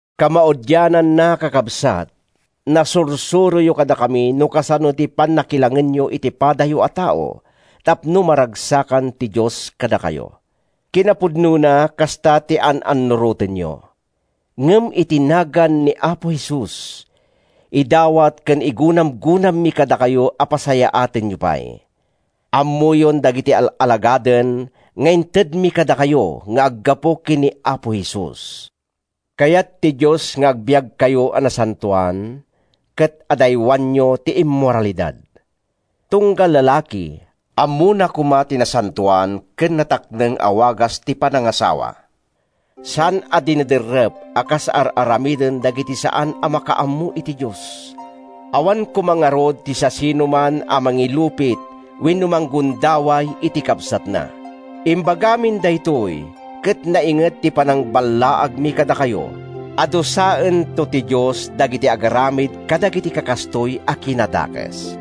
Kamaudiananna, kakabsat, nasursuroyo kadakami no kasano ti pannakilangenyo iti padayo a tao tapno maragsakan ti Dios kadakayo. Kinapudnona, kasta ti an-annurotenyo. Ngem iti nagan ni Apo Jesus, idawat ken igunamgunammi kadakayo a pasayaatenyo pay. Ammoyon dagiti al-alagaden nga intedmi kadakayo nga aggapu ken ni Apo Jesus. Kayat ti Dios nga agbiagkayo a nasantoan ket adaywanyo ti immoralidad. Tunggal lalaki ammona koma ti nasantoan ken natakneng a wagas ti panangasawa, saan a dinederrep a kas ar-aramiden dagiti saan a makaammo iti Dios. Awan koma ngarud ti siasinoman a mangilupit wenno manggundaway iti kabsatna. Imbagamin daytoy ket nainget ti panangballaagmi kadakayo a dusaento ti Dios dagiti agaramid kadagiti kakastoy a kinadakes.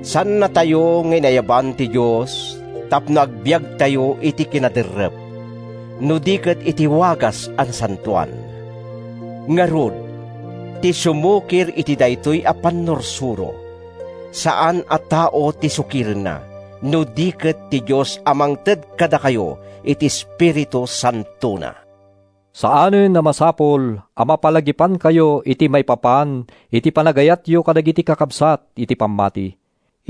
Saannatayo nga inayaban ti Dios tapno agbiagtayo iti kinaderrep, no di ket iti wagas a nasantoan. Ngarud, ti sumukir iti daytoy a pannursuro, saan a tao ti sukirenna, no di ket ti Dios a mangted kadakayo iti Espiritu Santona. Saanen a masapul a mapalagipankayo iti maipapan iti panagayatyo kadagiti kakabsat iti pammati.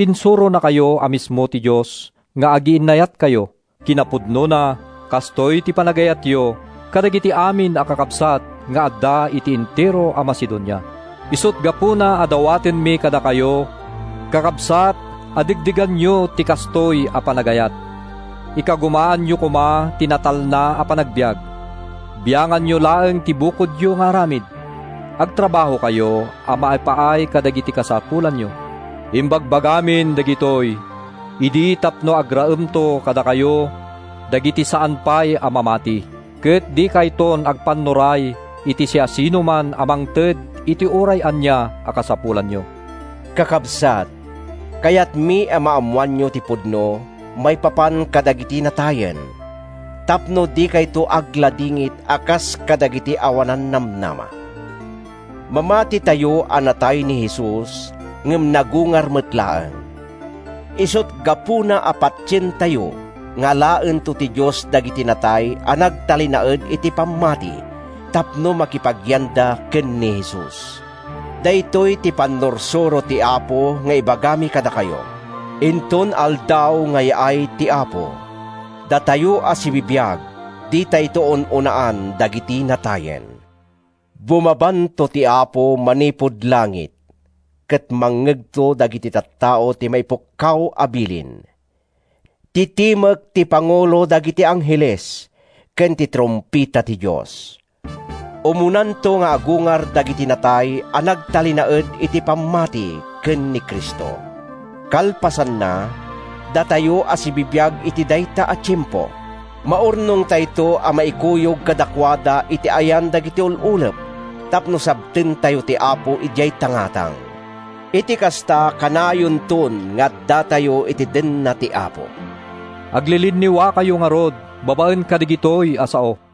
Insuronakayo a mismo ti Dios nga agiinnayatkayo. Kinapudnona, kastoy ti panagayatyo kadagiti amin a kakabsat nga adda iti entero a Macedonia. Isut’ gapuna a dawatenmi kadakayo, kakabsat, a degdeganyo ti kastoy a panagayat. Ikagumaanyo koma ti natalna a panagbiag. Bianganyo laeng ti bukodyo nga aramid. Agtrabahokayo a maipaay kadagiti kasapulanyo. Imbagbagamin dagitoy idi tapno agraemto kadakayo dagiti saan pay a mamati. Ket dikayton agpannuray iti siasinoman a mangted iti uray ania a kasapulanyo. Kakabsat, kayatmi a maammoanyo ti pudno maipapan kadagiti natayen, tapno dikayto agladingit a kas kadagiti awanan namnama. Mamatitayo a natay ni Jesus ngem nagungar met laeng. Isut’ gapuna a patientayo nga alaento ti Dios dagiti natay a nagtalinaed iti pammati tapno makipagyanda ken ni Jesus. Daytoy ti pannursuro ti Apo nga ibagami kadakayo: Inton aldaw nga yaay ti Apo, datayo a sibibiag ditayto un-unaan dagiti natayen. Bumabanto ti Apo manipud langit ket mangngegto dagiti tattao ti maipukkaw a bilin, ti timek ti pangulo dagiti angheles, ken ti trumpeta ti Dios. Umunanto nga agungar dagiti natay a nagtalinaed iti pammati ken ni Cristo. Kalpasanna, datayo a sibibiag iti dayta a tiempo, maurnongtayto a maikuyog kadakuada iti ayan dagiti ul-ulep tapno sabtentayo ti Apo idiay tangatang. Iti kasta, kanayonton nga addatayo iti denna ti Apo. Aglilinniwakayo ngarud babaen kadagitoy a sao.